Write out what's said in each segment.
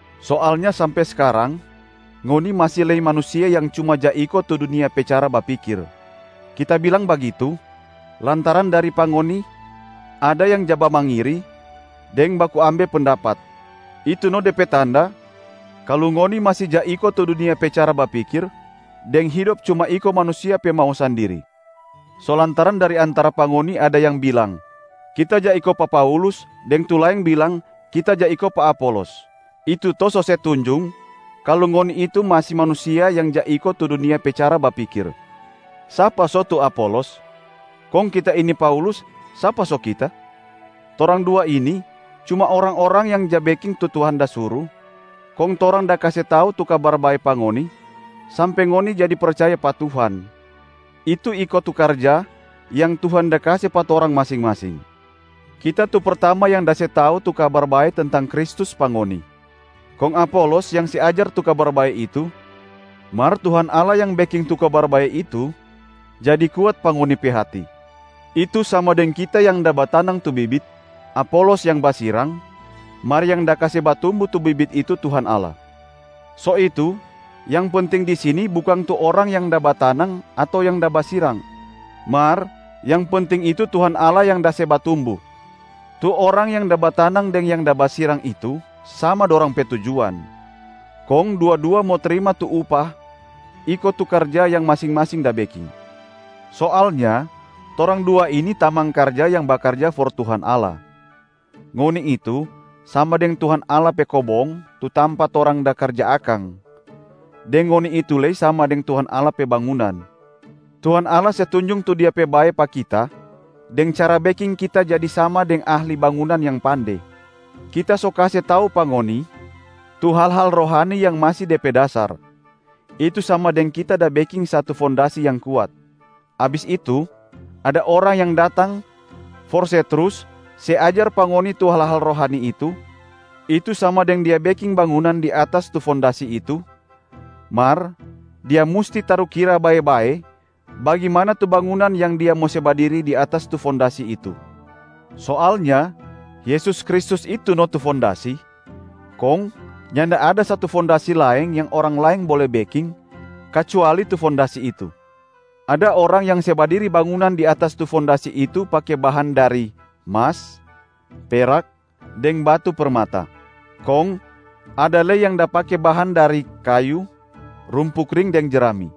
Soalnya sampe skarang, ngoni masi lei manusia yang cuma ja iko tu dunia pe cara bapikir. Kita bilang bagitu lantaran dari pa ngoni ada yang ja bamangiri deng baku ambe pendapat, itu no de pe tanda kalu ngoni masi ja iko tu dunia pe cara bapikir deng hidop cuma iko manusia pe mau sandiri. So lantaran dari antara pa ngoni ada yang bilang, “Kita ja iko pa Paulus,” deng tu laeng bilang, “Kita ja iko pa Apolos,” itu to so se tunjung kalu ngoni itu masi manusia yang ja iko tu dunia pe cara bapikir. Sapa so tu Apolos? Kong kita ini Paulus, sapa so kita? Torang dua ini cuma orang-orang yang ja beking tu Tuhan da suru, kong torang da kase tau tu Kabar Bae pa ngoni sampe ngoni jadi percaya pa Tuhan, itu iko tu karja yang Tuhan da kase pa torang masing-masing. Kita tu pertama yang da se tau tu Kabar Bae tentang Kristus pa ngoni, kong Apolos yang se ajar tu Kabar Bae itu, mar Tuhan Allah yang beking tu Kabar Bae itu jadi kuat pa ngoni pe hati. Itu sama deng kita yang da batanang tu bibit, Apolos yang basirang, mar yang da kase batumbu tu bibit itu Tuhan Allah. So itu, yang penting di sini bukang tu orang yang da batanang ato yang da basirang, mar yang penting itu Tuhan Allah yang da se batumbu. Tu orang yang da batanang deng yang da basirang itu sama dorang pe tujuan, kong dua-dua mo trima tu upah iko tu karja yang masing-masing da beking. Soalnya torang dua ini tamang karja yang bakarja for Tuhan Allah. Ngoni itu sama deng Tuhan Allah pe kobong tu tampa torang da karja akang, deng ngoni itu lei sama deng Tuhan Allah pe bangunan. Tuhan Allah se tunjung tu Dia pe bae pa kita deng cara beking kita jadi sama deng ahli bangunan yang pande. Kita so kase tau pa ngoni tu hal-hal rohani yang masi de pe dasar, itu sama deng kita da beking satu fondasi yang kuat. Abis itu ada orang yang datang for se trus se ajar pa ngoni tu hal-hal rohani itu, itu sama deng dia beking bangunan di atas tu fondasi itu, mar dia musti tarukira bae-bae bagimana tu bangunan yang dia mo se badiri di atas tu fondasi itu. Soalnya Yesus Kristus itu no tu fondasi, kong nyanda ada satu fondasi laeng yang orang laeng bole beking, kacuali tu fondasi itu. Ada orang yang se badiri bangunan di atas tu fondasi itu pake bahan dari: mas, perak, deng batu permata. Kong ada lei yang da pake bahan dari: kayu, rumpu kring deng jerami.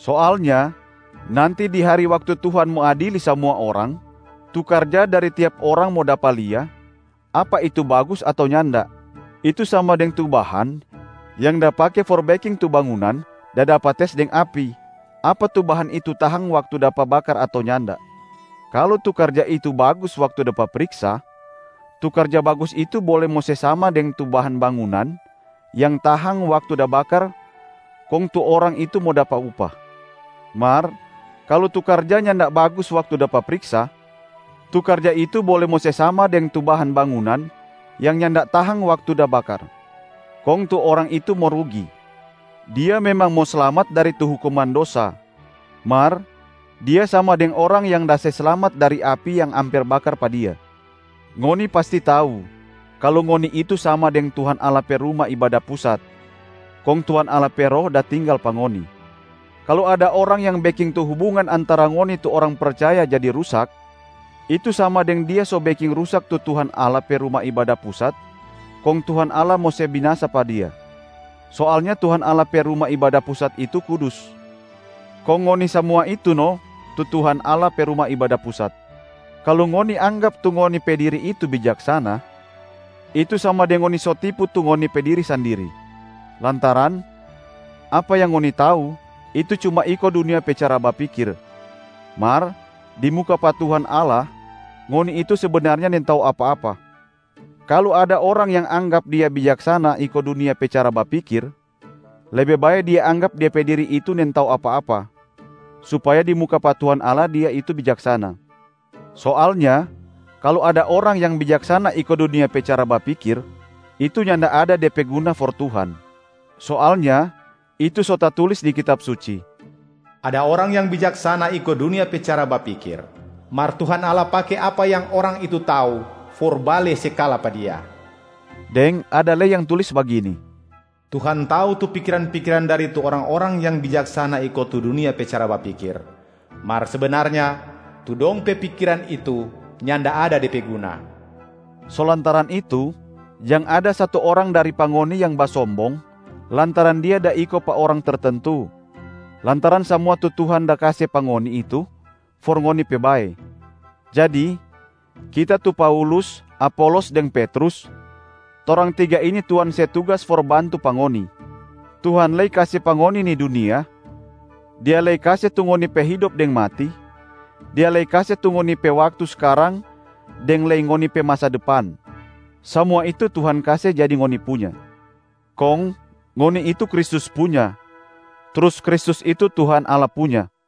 Soalnya nanti di hari waktu Tuhan mo adili samua orang, tu karja dari tiap orang mo dapa lia, apa itu bagus ato nyanda, itu sama deng tu bahan yang da pake for beking tu bangunan da dapa tes deng api, apa tu bahan itu tahang waktu dapa bakar ato nyanda. Kalu tu karja itu bagus waktu dapa priksa, tu karja bagus itu bole mo se sama deng tu bahan bangunan yang tahang waktu da bakar kong tu orang itu mo dapa upah. Mar kalu tu karja nyanda bagus waktu dapa priksa, tu karja itu bole mo se sama deng tu bahan bangunan yang nyanda tahang waktu da bakar, kong tu orang itu mo rugi. Dia memang mo slamat dari tu hukuman dosa, mar dia sama deng orang yang da se slamat dari api yang amper bakar pa dia. Ngoni pasti tau kalu ngoni itu sama deng Tuhan Allah pe Ruma Ibada Pusat, kong Tuhan Allah pe Roh da tinggal pa ngoni. Kalu ada orang yang beking tu hubungan antara ngoni tu orang percaya jadi rusak, itu sama deng dia so beking rusak tu Tuhan Allah pe Ruma Ibada Pusat kong Tuhan Allah mo se binasa pa dia. Soalnya Tuhan Allah pe Ruma Ibada Pusat itu kudus, kong ngoni samua itu no tu Tuhan Allah pe Ruma Ibada Pusat. Kalu ngoni anggap tu ngoni pe diri itu bijaksana, itu sama deng ngoni so tipu tu ngoni pe diri sandiri, lantaran apa yang ngoni tau itu cuma iko dunia pe cara bapikir, mar di muka pa Tuhan Allah ngoni itu sebenarnya nintau apa-apa. Kalu ada orang yang anggap dia bijaksana iko dunia pe cara bapikir, lebe bae dia anggap de pe diri itu nintau apa-apa, supaya di muka pa Tuhan Allah dia itu bijaksana. Soalnya kalu ada orang yang bijaksana iko dunia pe cara bapikir, itu nyanda ada de pe guna for Tuhan. Soalnya itu so tatulis di Kitab Suci, “Ada orang yang bijaksana iko dunia pe cara bapikir, mar Tuhan Allah pake apa yang orang itu tau for bale se kala pa dia.” Deng ada lei yang tulis bagini, “Tuhan tau tu pikiran-pikiran dari tu orang-orang yang bijaksana iko tu dunia pe cara bapikir, mar sebenarnya tu dong pe pikiran itu nyanda ada de pe guna.” So lantaran itu, jang ada satu orang dari pa ngoni yang basombong lantaran dia da iko pa orang tertentu, lantaran samua tu Tuhan da kase pa ngoni itu for ngoni pe bae. Jadi kita tu Paulus, Apolos, deng Petrus, torang tiga ini Tuhan se tugas for bantu pa ngoni. Tuhan lei kase pa ngoni ni dunia, Dia lei kase tu ngoni pe hidop deng mati, Dia lei da kase tu ngoni pe waktu skarang deng lei ngoni pe masa depan. Samua itu Tuhan kase jadi ngoni punya. Kong ngoni itu Kristus punya, trus Kristus itu Tuhan Allah punya.